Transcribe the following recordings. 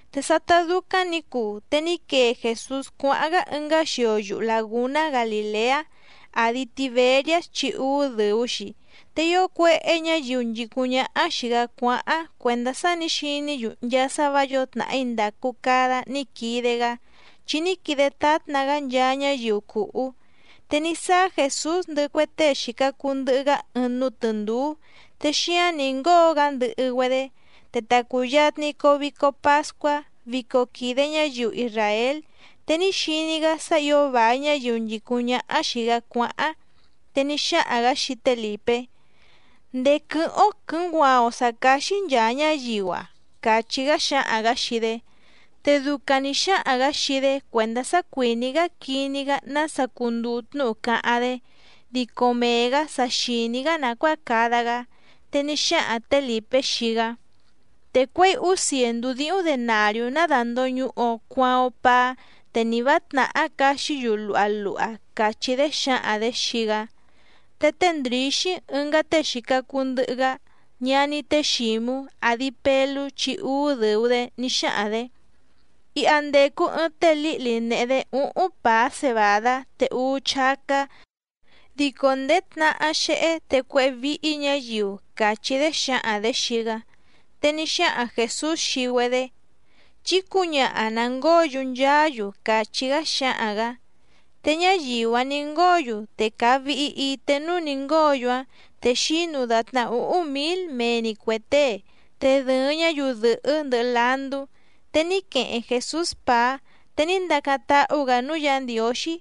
Te sátá dúcáⁿ nǐ cuu, te ní quee Jèsús cuáháⁿ‑gá ɨngá xio yuhu làgúná Galìleá, àdi Tiberiás chi úú dɨ̀u‑xi. Te ío cuéhé ñǎyiu nchìcúⁿ ñáhá xìi‑gá cuáháⁿ cuèndá sá nǐ xiní‑yu nchaa sá vǎ yǒo tnàhí ndàcu cada ní quide‑gá, chi ní quide tátna‑gá nchaa ñáyiu cùhú. Te ní sáá Jèsús ndɨhɨ cue tée xìca cuu ndɨhɨ‑gá ɨɨⁿ núú tɨ̀ndúú, te xíáⁿ nǐ ngóo‑gá ndɨhɨ‑güedé. Te ta cùyatni coo vico pascuá, vico quìde ñáyiu isràél. Te ní xiní‑gá sá ǐo vài ñáyiu nchìcúⁿ ñáhá xìi‑gá cuáháⁿ, te ní xáhaⁿ‑gǎ xii té Lìpé: —¿Ndèé quɨ́hɨ́ⁿ‑ó quɨ̌nguaaⁿ‑o sǎ cáxí nchàa ñáyiu‑a? —càchí‑gá xáhaⁿ‑gǎ xii‑dé. Te ducaⁿ nǐ xáhaⁿ‑gǎ xii‑dé cuèndá sá cuìní‑gá quiní‑gá nása cunduu tnúhu cáháⁿ‑dé, dico mee‑gǎ sa xìní‑gá nàcuáa cada‑gá. Te ní xáhaⁿ tě Lìpé xii‑gá: —Te cuěi úú cièndú díhúⁿ denàriú ná dàndoñuhu‑o cuaaⁿ‑o paá, te ni vǎ tnàhá caxí‑yu luha luha —càchí‑dé xǎhaⁿ‑dě xii‑gá. Te té Ndrǐxí ɨngá tée xìca cuu ndɨhɨ‑gá, ñaní té Xǐmú, àdi Pelú chi úú dɨ̀u‑dé, ní xáhaⁿ‑dě: —Iha ndècu ɨɨⁿ té lǐhli nèhe‑dé úhúⁿ pàá cebàdá te úú chácá, dico nděé tnahá xéhé, te cuéhé víhí ñǎyiu —càchí‑dé xǎhaⁿ‑dě xii‑gá. Te ní xáhaⁿ Jèsús xii‑güedé: —Chí cǔñaha nà ngóo‑yu nchaá‑yu —càchí‑gá xáhaⁿ‑gǎ. Te ñáyiu‑áⁿ nǐ ngóo‑yu, te càa vihi ité núú nǐ ngóo‑yu‑áⁿ, te xínu dàtná úhúⁿ mǐl mee‑ni cuè tée, te dɨ̀ɨⁿ ñáyiu dɨ̀hɨ́ ndɨhɨ landú. Te ní queheⁿ Jèsús pàá, te ní ndacáⁿ táhú‑gǎ núú Yǎ Ndiǒxí,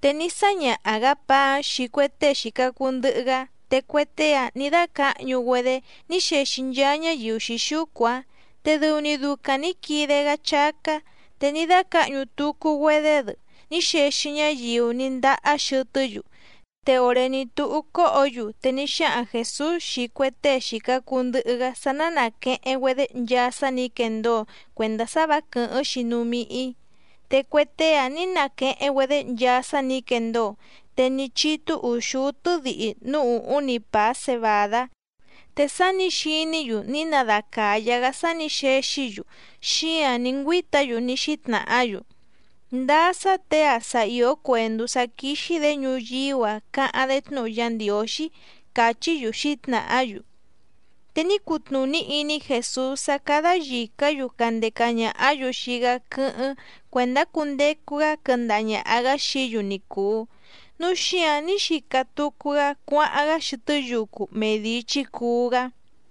te ní sáñaha‑gǎ pàá‑áⁿ xii cue tée xìca cuu ndɨhɨ‑gá, te cue tée‑áⁿ nǐ dácǎhñu‑güedé ní xexi nchaa ñáyiu xǐxúcu‑áⁿ. Te dɨu‑ni ducaⁿ nǐ quide‑gá chácá, te ní dácǎhñu tucu‑güedé‑dɨ ní xexi ñáyiu ní ndahá xɨtɨ́‑yu. Te òré ní túhú cóhǒ‑yu, te ní xáhaⁿ Jèsús xii cue tée xìca cuu ndɨhɨ‑gá sá ná nàqueheⁿ‑güedé nchaa sá nǐ quendóo cuèndá sá vǎ quɨ̀hɨ́ⁿ‑xi núú míhí. Te cue tée‑ǎⁿ ní naqueheⁿ‑güedé nchaa sá nǐ quendóo, te ní chítú ùxúú tɨ́dihi núú ùhúⁿ‑ni pàá cebàdá. Te sá nǐ xiní‑yu ní nadacàyá‑gá sá nǐ xexí‑yu, xíǎⁿ ní ngüíta‑yu ní xítnàhá‑yu: —Ndáá sá těe‑a sa ìó cuèndú sá quíxí‑dě ñuyíú‑a cáháⁿ‑dé tnúhu Yá Ndiǒxí —càchí‑yu xǐtnàhá‑yu. Te ní cutnùní iní Jèsús sá cádá yìcá‑yu candeca ñàhá‑yu xii‑gá quɨ́hɨ́ⁿ cuèndá cundecu‑gá quɨndaha ñàha‑gá xií‑yu ni cùu, núu xíǎⁿ ní xica tucu‑gá cuáháⁿ‑gá xɨtɨ́ yucu mee dìi chícuú‑gá.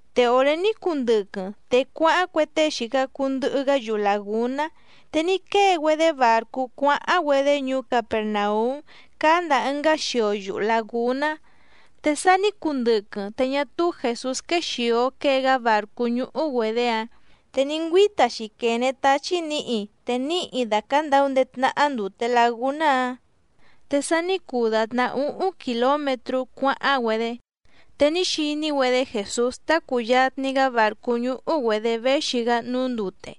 Te òré ní cuu ndɨquɨⁿ, te cuáháⁿ cue tée xìca cuu ndɨhɨ‑gá yuhu làgúná. Te ní quée‑güedé bàrcú cuáháⁿ‑güedé ñuú Capèrnaúm cáá ndàa ɨngá xio yuhu làgúná, te sa ní cuu ndɨquɨⁿ, te ñá túú Jèsús quéxìo quée‑gá bàrcú ñúhú‑güedě‑áⁿ. Te ní ngüíta‑xi quène táchí nǐhi, te níhi dàcandau ndéé tnáhá ndùte lagúná‑áⁿ. Te sa ní cuu dàtná úhúⁿ kìlómetrú cuáháⁿ‑güedé, te ní xiní‑güedé Jèsús tá cùyatni‑gá bàrcú ñúhú‑güedě véxi‑gá núú ndúté,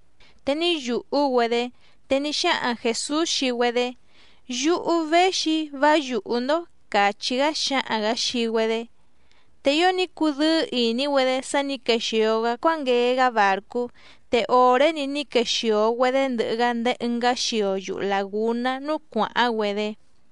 te ní yùhú‑güedé. Te ní xáhaⁿ Jèsús xii‑güedé: —Yúhú véxi‑í, vá yùhú‑ndó —càchí‑gá xáhaⁿ‑gǎ xii‑güedé. Te ío ní cudɨ́ɨ́ ìní‑güedé sá nǐ quexìo‑gá cuánguee‑gá bàrcú, te òré‑ni ní quexìo‑güedé ndɨhɨ‑gá ndéé ɨngá xio yuhu làgúná núú cuàháⁿ‑güedé.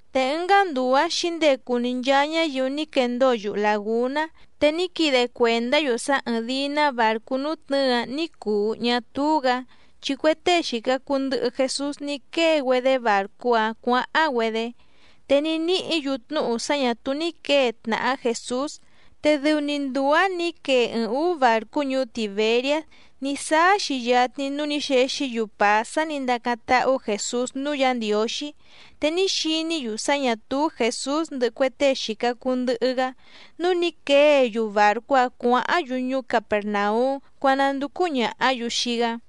Te ɨngá nduu‑ǎⁿ xǐndecu‑ni nchaa ñáyiu ní quendóo yuhu làgúná. Te ní quide cuèndá‑yu sá ɨ́ɨ́ⁿ dìi‑ná bàrcú nútnɨ̌ɨ‑áⁿ ní cùu ñá túú‑gǎ, chi cue tée xìca cuu ndɨhɨ Jesús ní quée‑güedé bàrcú‑áⁿ cuǎháⁿ‑güedé. Te ní níhǐ‑yu tnúhu sá ñà túú ní quěe tnàhá Jèsús. Te dɨu‑ni nduu‑ǎⁿ nǐ quee ɨɨⁿ ǔú bàrcú ñuú Tìberiás ní sáá‑xi yatni núú nǐ xexí‑yu pàá sá nǐ ndacáⁿ táhú Jèsús núú Yǎ Ndiǒxí. Te ní xiní‑yu sá ñà túú Jèsús ndɨhɨ cue tée xìca cuu ndɨhɨ‑gá, núu ní quée‑yu bàrcú‑áⁿ cuǎháⁿ‑yu ñuú Capèrnaúm cuánúndúcú ñàhá‑yu xii‑gá.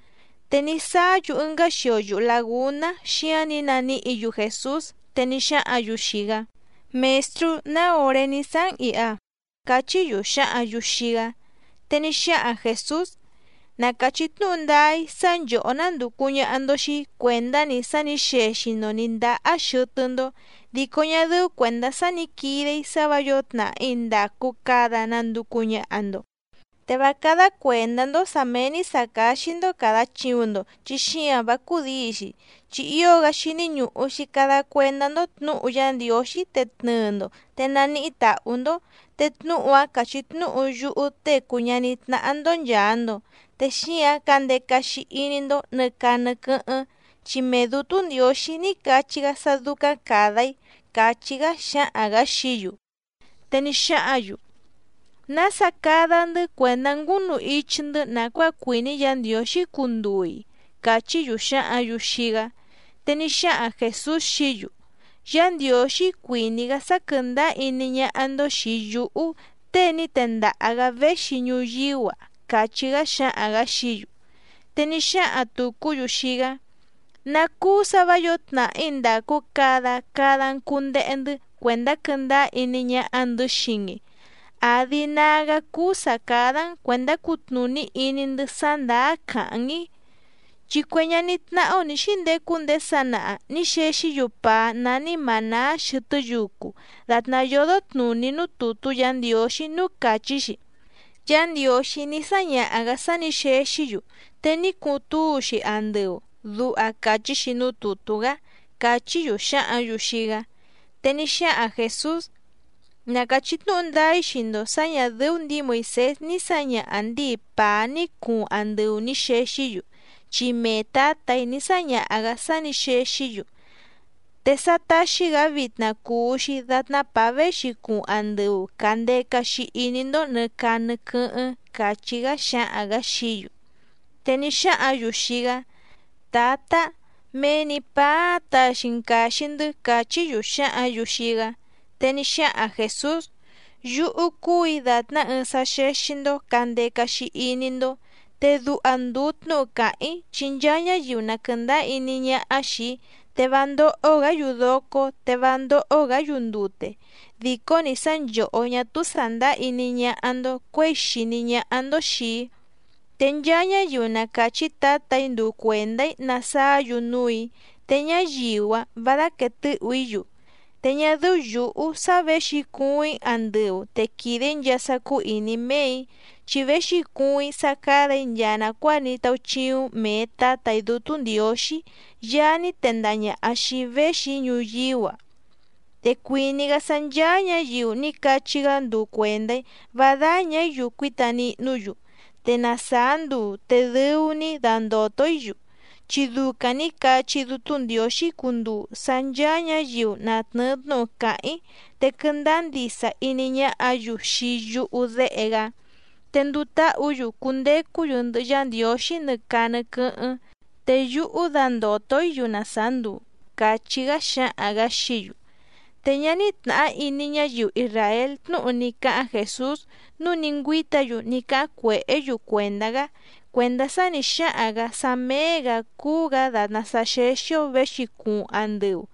Te ní sáá‑yu ɨngá xio yuhu làgúná, xíáⁿ nǐ naníhǐ‑yu Jèsús, te ní xáhǎⁿ‑yu xii‑gá: —Mèstrú, ¿ná òré ní sáá‑n ìha? —cachí‑yu xǎhǎⁿ‑yu xii‑gá. Te ní xáhaⁿ Jèsús: —Na càchí tnúhu ndáá‑í sá nchòhó nándùcu ñaha‑ndo xii‑í cuèndá‑ni sá nǐ xexi‑ndo nǐ ndahá xɨtɨ́‑ndó, dico ñá dɨ́ú cuèndá sá nǐ quide‑í sá vǎ yǒo tnàhí ndàcu cada nanducu ñaha‑ndo. Te vá cádá cuèndá‑ndó sǎ méé‑ní sǎ cáxí‑ndó càda chiuⁿ‑ndo chi xíǎⁿ vá cúdǐi‑xi. Chi ío‑gá xíní ñùhu‑xi cada cuendá‑ndó tnǔhu Yá Ndiǒxí te tnɨɨ‑ndo, te naníhí tàhú‑ndó. Te tnúhu‑áⁿ cachí tnúhu yúhú Tée cùu ñaní tnáhá‑ndó nchàa‑ndo, te xíǎⁿ candeca‑xi iní‑ndó nɨ̀ caa nɨ quɨ́hɨ́ⁿ, chi mee Dǔtú Ndiǒxí ní cachí‑gá sá dúcáⁿ càda‑í —càchí‑gá xáhaⁿ‑gǎ xií‑yu. Te ní xáhǎⁿ‑yu: —¿Nása cada‑ndɨ́ cuèndá ngúnu ichi‑ndɨ́ nàcuáa cuìní Yǎ Ndiǒxí cunduu‑i? —càchí‑yu xǎhǎⁿ‑yu xii‑gá. Te ní xáhaⁿ Jèsús xií‑yu: —Yá Ndiǒxí cuìní‑gá sá quɨ̀ndáá iní ñáhá‑ndó xìi yúhú, tée ní tendaha‑gǎ véxi ñuyíú‑a —càchí‑gá xáhaⁿ‑gǎ xií‑yu. Te ní xáhaⁿ tùcú‑yu xii‑gá: —¿Ná cúú sǎ vǎ yǒo tnàhí ndàcu cada, cada‑n cùndehe‑ndɨ́ cuèndá quɨ́ndáá iní ñáhá‑ndɨ̌ xii‑n‑i? ¿Àdi nágá cúú sǎ cádá‑n cuèndá cutnùní iní‑ndɨ́ sá ndàá càháⁿ‑n‑í? Chi cue ñaní tnáhá‑ó nǐ xíndecu ndéé sanaha nǐ xexí‑yu pàá nání mànáá xɨtɨ́ yucu dàtná yódó tnùní núú tùtú Yǎ Ndiǒxí núú càchí‑xi: “Yá Ndiǒxí ní sáñaha‑gǎ sá nǐ xexí‑yu, te ní cuuⁿ túu‑xi andɨu”, duha càchí‑xi núú tùtú‑gá —càchí‑yu xǎhǎⁿ‑yu xii‑gá. Te ní xáhaⁿ Jèsús: —Na càchí tnúhu ndáá‑í xii‑ndo sǎ ñà dɨ́ú ndǐi Moìsés ní sǎñaha ndǐi pàá ní cuuⁿ andɨu nǐ xexí‑yu, chi mee Tǎtà‑í ní sáñaha‑gǎ sá nǐ xexí‑yu. Te sá táxí‑gǎ vitna cùu‑xi datná pàá véxi cuuⁿ andɨu càndeca‑xi iní‑ndó nɨ̀ caa nɨ quɨ́hɨ́ⁿ —càchí‑gá xáhaⁿ‑gǎ xií‑yu. Te ní xáhǎⁿ‑yu xii‑gá: —Tǎtá, mee‑ni pàá‑áⁿ taxi‑n càxi‑ndɨ́ —càchí‑yu xǎhǎⁿ‑yu xii‑gá. Te ní xáhaⁿ Jèsús: —Yúhú cúù‑í dàtná ɨɨⁿ sá xéxí‑ndó cǎndeca‑xi iní‑ndó. Te duha ndùu tnúhu càháⁿ‑í, chi nchaa ñáyiu na quɨ̀ndáá iní ñáhá xìi‑í, te vá ndóhó‑gǎ‑yu docó te vá ndóhó‑gǎ‑yu ndute. Dìcó‑ni sá nchòhó ñá túú sàndáá iní ñáhá‑ndó cuěi xìní ñáhá‑ndó xìi‑í. Te nchaa ñáyiu na càchí Tǎtà‑í nduu cuèndá‑í nasaá‑yu núù‑í, te ñáyiu‑áⁿ vǎ dáquèe tɨ́hù‑í‑yu. Te ñá dɨ́ú yǔhú sá věxi cuuⁿ‑í andɨu te quìde‑í nchaa sá cúú ìní méè‑í, chi véxi cuuⁿ‑í sá cádà‑í nchaa nàcuáa ní táúchíúⁿ mèe Tátà‑í Dútú Ndiǒxí Yaá ní tendaha ñàha xii‑í véxi‑í ñuyíú‑a. Te cuìní‑gá sá ncháá ñǎyiu ní cachí‑gá nduu cuèndá‑í vá dáñà‑í‑yu cuíta nihnú‑yu, te na sàá nduu te dɨu‑ni‑í dandòto‑í‑yu. Chi ducaⁿ nǐ cachí Dútú Ndiǒxí cunduu sá ncháá ñǎyiu na tnɨ̀ɨ tnúhu càháⁿ‑í, te quɨndáá ndisa iní ñáhǎ‑yu xii yúhú Déhe‑gá, te nduu táhǔ‑yu cundecú‑yu ndɨhɨ Yá Ndiǒxí nɨ caa nɨ quɨ́hɨ́ⁿ, te yúhú dandòto‑í‑yu na sàá nduu —càchí‑gá xáhaⁿ‑gǎ xií‑yu. Te ñá ní tnàhá iní ñáyiu isràél tnúhu ní cáháⁿ Jèsús nǔu ní ngüíta‑yu ní cáháⁿ cuèhé‑yu cuèndá‑gá cuèndá sá nǐ xáhaⁿ‑gǎ sá méé‑gǎ cúú‑gǎ dàtná sá xéxí‑ó věxi cuuⁿ andɨu.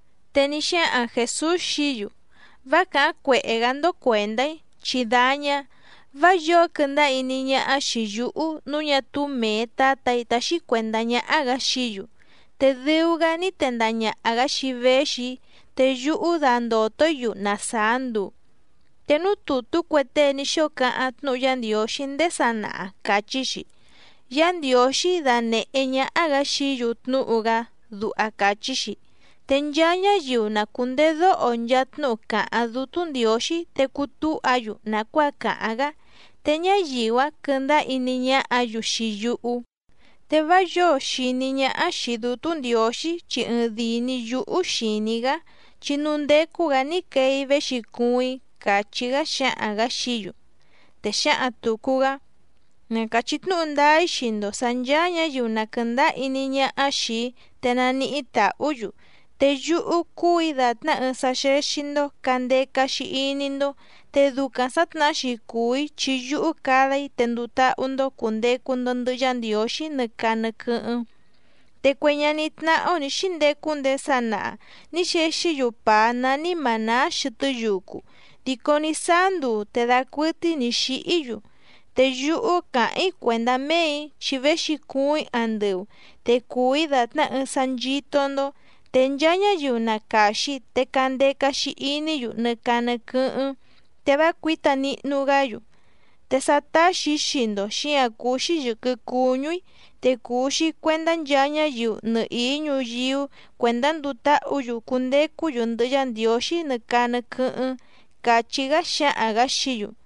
Te ní xáhaⁿ Jèsús xií‑yu: —Vá càháⁿ cuèhé‑gá‑ndó cuèndá‑í, chí dáñá. Vá yǒo quɨndáá iní ñáhá xìi yúhú nǔu ñá túú mèe Tátà‑í táxí cuèndá ñáhá‑gǎ xií‑yu. Te dɨu‑gá ní tendaha ñàha‑gá xii‑í véxi‑í, te yúhú dandòto‑í‑yu na sàá nduu. Te núú tùtú cue tée ní xóo cáháⁿ tnúhu Yá Ndiǒxí ndéé sanaha càchí‑xi: “Yá Ndiǒxí danèhé ñáhá‑gǎ xií‑yu tnúhu‑gá”, duha càchí‑xi. Te nchaa ñáyiu na cùndedóho nchaa tnúhu càháⁿ Dútú Ndiǒxí, te cutúha‑yu nàcuáa càháⁿ‑gá, te ñáyiu‑áⁿ quɨ̀ndáá iní ñáhǎ‑yu xii yúhú. ’Te vá yǒo xìní ñáhá xìi Dútú Ndiǒxí chi ɨɨⁿdìi‑ni yúhú xìní‑í‑gá, chi núú ndécú‑gǎ ní quee‑í véxi cuuⁿ‑í —càchí‑gá xáhaⁿ‑gǎ xií‑yu. Te xǎhaⁿ tùcu‑gá: —Na càchí tnúhu ndáá‑í xii‑ndo sǎ nchàa ñáyiu na quɨ̀ndáá iní ñáhá xìi‑í, te naníhí tàhú‑yu. Te yúhú cúù‑í dàtná ɨɨⁿ sá xéxí‑ndó cǎndeca‑xi iní‑ndó, te ducaⁿ sǎtnahá‑xi cùu‑í chi yúhú cada‑í te nduu táhú‑ndó cùndecu‑ndo ndɨhɨ Yá Ndiǒxí nɨ caa nɨ quɨ́hɨ́ⁿ. Te cue ñaní tnáhá‑ó nǐ xíndecu ndéé sanaha nǐ xexí‑yu pàá nání mànáá xɨtɨ́ yucu, dico ní sáá nduu te dacuɨtɨ́í nǐ xíhí‑yu. Te yúhú càháⁿ‑í cuèndá méè‑í, chi véxi cuuⁿ‑í andɨu. Te cùu‑í dàtná ɨɨⁿ sá nchító‑ndó, te nchaa ñáyiu na càxi te candeca‑xi iní‑yu nɨ caa nɨ quɨ́hɨ́ⁿ te vá cuǐta nihnu‑gá‑yu. Te sá táxì‑í xii‑ndo xíǎⁿ cúú‑xí yɨ̀quɨ cuñú‑í, te cùu‑xi cuendá nchaa ñáyiu nɨhìí ñuyíú cuèndá nduu táhǔ‑yu cundecú‑yu ndɨhɨ Yá Ndiǒxí nɨ caa nɨ quɨ́hɨ́ⁿ —càchí‑gá xáhaⁿ‑gǎ xií‑yu.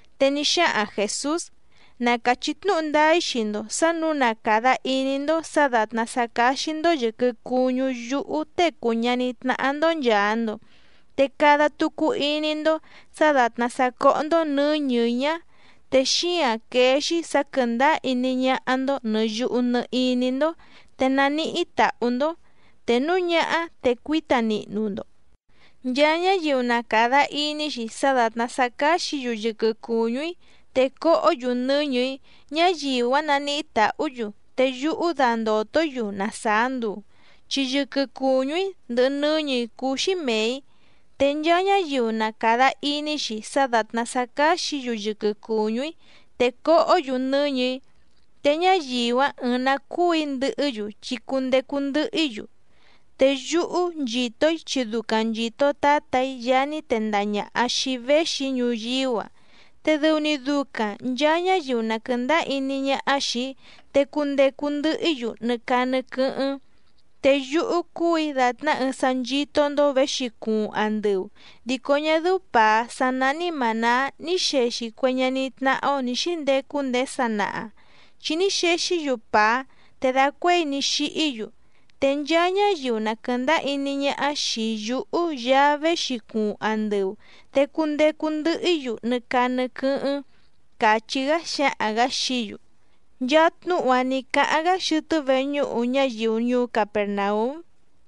Te ní xáhaⁿ Jèsús: —Na càchí tnúhu ndáá‑í xii‑ndo sǎ nǔu na càda iní‑ndó sǎ dàtná sá cáxí‑ndó yɨ̀quɨ cuñú yúhú Tée cùu ñaní tnáhá‑ndó nchàa‑ndo, te cada tucu iní‑ndó sǎ dàtná sá cóhó‑ndó nɨ̌ñɨ̀‑í ñá, te xíǎⁿ quéé‑xí sǎ quɨ̀ndáá iní ñáhá‑ndó nɨ̀ yuhu nɨ iní‑ndó te naníhí tàhú‑ndó, te núu ñáhá te cuíta nihnu‑ndo. Nchaa ñáyiu na càda iní‑xi sá dàtná sá cáxǐ‑yu yɨquɨ cùñú‑í te cohó‑yu nɨ́ñɨ̀‑í, ñáyiu‑áⁿ naníhí tàhú‑yu te yúhú dandòto‑í‑yu na sàá nduu. Chi yɨquɨ cùñú‑í ndɨhɨ nɨ́ñɨ̀‑í cúú‑xí mèe‑í. Te nchaa ñáyiu na càda iní‑xi sá dàtná sá cáxǐ‑yu yɨquɨ cùñú‑í te cohó‑yu nɨ́ñɨ̀‑í, te ñáyiu‑áⁿ ɨɨⁿ‑nǎ cuu‑í ndɨhɨ́‑yu chi cundecu ndɨhɨ‑í‑yu. Te yúhú nchìto‑í chi ducaⁿ nchìto Tátà‑í Yaá ní tendaha ñàha xii‑í véxi‑í ñuyíú‑a. Te dɨu‑ni ducaⁿ nchàa ñáyiu na quɨ̀ndáá iní ñáhá xìi‑í te cundecu ndɨhɨ‑í‑yu nɨ caa nɨ quɨ́hɨ́ⁿ. Te yúhú cúù‑í dàtná ɨɨⁿ sá nchító‑ndó věxi cuuⁿ andɨu, dico ñá dɨ́ú pàá sá nání mànáá ní xèxi cue ñaní tnáhá‑ó nǐ xíndecu ndéé sanaha, chi ní xexí‑yu pàá te dacuéi ní xíhí‑yu. Te nchaa ñáyiu na quɨ̀ndáá iní ñáhá xìi yúhú Yaá véxi cuuⁿ andɨu, te cundecu ndɨhɨ‑í‑yu nɨ caa nɨ quɨ́hɨ́ⁿ —càchí‑gá xáhaⁿ‑gǎ xií‑yu. Nchaa tnúhu‑a ní cáháⁿ‑gá xɨtɨ́ veñúhu ñáyiu ñuú Capèrnaúm.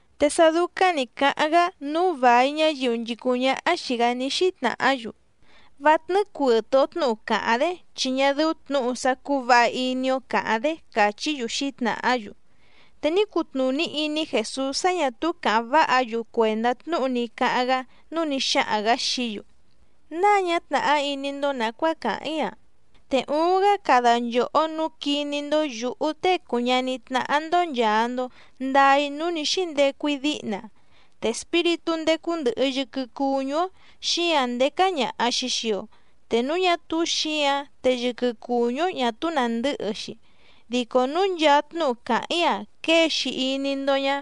Te sá dúcáⁿ nǐ cáháⁿ‑gá nǔu vài ñáyiu nchìcúⁿ ñáhá xìi‑gá ní xítnàhá‑yu: —Vá tnɨ́ɨ́ cuɨ̀tɨ‑o tnúhu càháⁿ‑dé chi ñá dɨ́ú tnǔhu sá cúú vǎha iní‑ó càháⁿ‑dé —càchí‑yu xǐtnàhá‑yu. Te ní cutnùní iní Jèsús sá ñà túú càháⁿ váha‑yu cuèndá tnúhu ní cáháⁿ‑gá, núu ní xáhaⁿ‑gǎ xií‑yu: —¿Náa ñá tnàhá iní‑ndó nàcuáa càháⁿ‑í‑a? Te uuⁿ‑gá cada nchòhó nǔu quiní‑ndó yǔhú Tée cùu ñaní tnáhá‑ndó nchàa‑ndo ndaa‑í núú nǐ xíndecu‑í díhna. Te espíritú ndécú ndɨ̀hɨ yɨquɨ cuñú‑ó, xíǎⁿ ndécá ñàha‑xi xii‑o, te núu ñá túú xǐǎⁿ, te yɨquɨ cùñú‑ó ñà túú nàndɨ́hɨ‑xi. Dico núu nchaa tnúhu càháⁿ‑í‑a quée‑xi iní‑ndó ñá,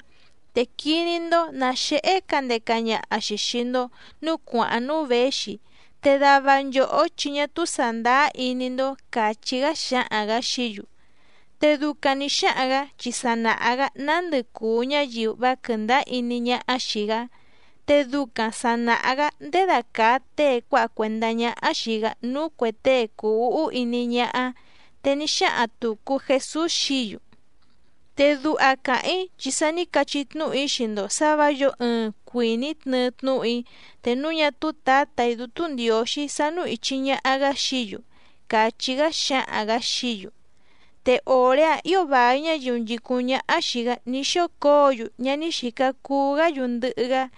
te quiní‑ndó nǎ xéhé candeca ñaha‑xi xìi‑ndo núú cuàháⁿ núú věxi. Te dava nchòhó chi ñá túú sàndáá iní‑ndó —càchí‑gá xáhaⁿ‑gǎ xií‑yu. Te ducaⁿ nǐ xáhaⁿ‑gǎ chi sa nàha‑gá nándɨ cùu ñáyiu vá quɨ̀ndáá iní ñáhá xìi‑gá. Te ducaⁿ sà naha‑gá ndědacàa tée cuáha cuèndá ñáhá xìi‑gá núú cuè tée cùu úhú iní ñáhá. Te ní xáhaⁿ tùcu Jesús xií‑yu: —Te duha càháⁿ‑í chi sa ní cachí tnúhu‑í xii‑ndo sǎ vǎ yǒo ɨɨⁿ cuìní tnɨɨ tnúhu‑í te núu ñá túú Tǎtà‑í Dútú Ndiǒxí sánú ìchi ñaha‑gá xií‑yu —càchí‑gá xáhaⁿ‑gǎ xií‑yu. Te òré‑áⁿ ǐo vài ñáyiu nchìcúⁿ ñáhá xìi‑gá ní xócǒo‑yu ñá ní xìca cuu‑gá‑yu ndɨhɨ‑gá.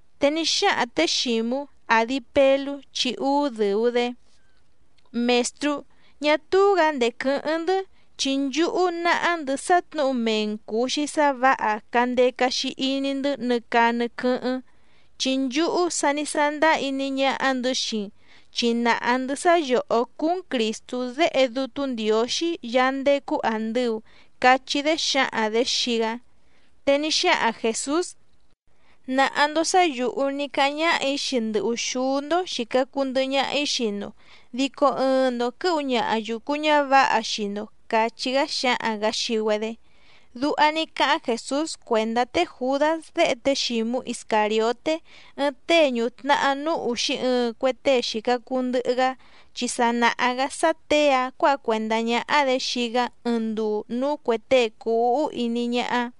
Te ní xáhaⁿ tě Xǐmú, àdi Pelú chi úú dɨ̀u‑dé: —Mèstrú, ñá túú‑gǎ ndèé quɨ́hɨ́ⁿ‑ndɨ́, chi nchúhú náhá‑ndɨ̌ sá tnǔhu mee‑n cùu‑xi sá vǎha candeca‑xi iní‑ndɨ́ nɨ caa nɨ quɨ́hɨ́ⁿ. Chi nchúhú sa ní sándáá iní ñáhá‑ndɨ̌ xii‑n chi nàha‑ndɨ́ sá yòhó cúú‑n Crìstú Déhe Dútú Ndiǒxí yaá ndécú àndɨu —cachí‑dé xǎhaⁿ‑dě xii‑gá. Te ní xáhaⁿ Jèsús: —Nàha‑ndo sá yǔhú ní cáháⁿ ñáhà‑í xii ndɨ ùxúú‑ndó xìca cuu ndɨhɨ ñaha‑í xii‑ndo, dico ɨɨⁿ‑ndo quɨ̌hu ñaha yùcu ñávǎha xii‑ndo —càchí‑gá xáhaⁿ‑gǎ xii‑güedé. Duha ní cáháⁿ Jèsús cuèndá té Jùdás déhe té Xǐmú Iscàrioté ɨɨⁿ tée ñùtnahá núú ùxí ɨɨⁿ cue tée xìca cuu ndɨhɨ‑gá, chi sa nàha‑gá sá těe‑ǎⁿ cuǎha cuèndá ñáhá‑dě xii‑gá ɨɨⁿ nduu núú cuè tée cùu úhú iní ñáhá.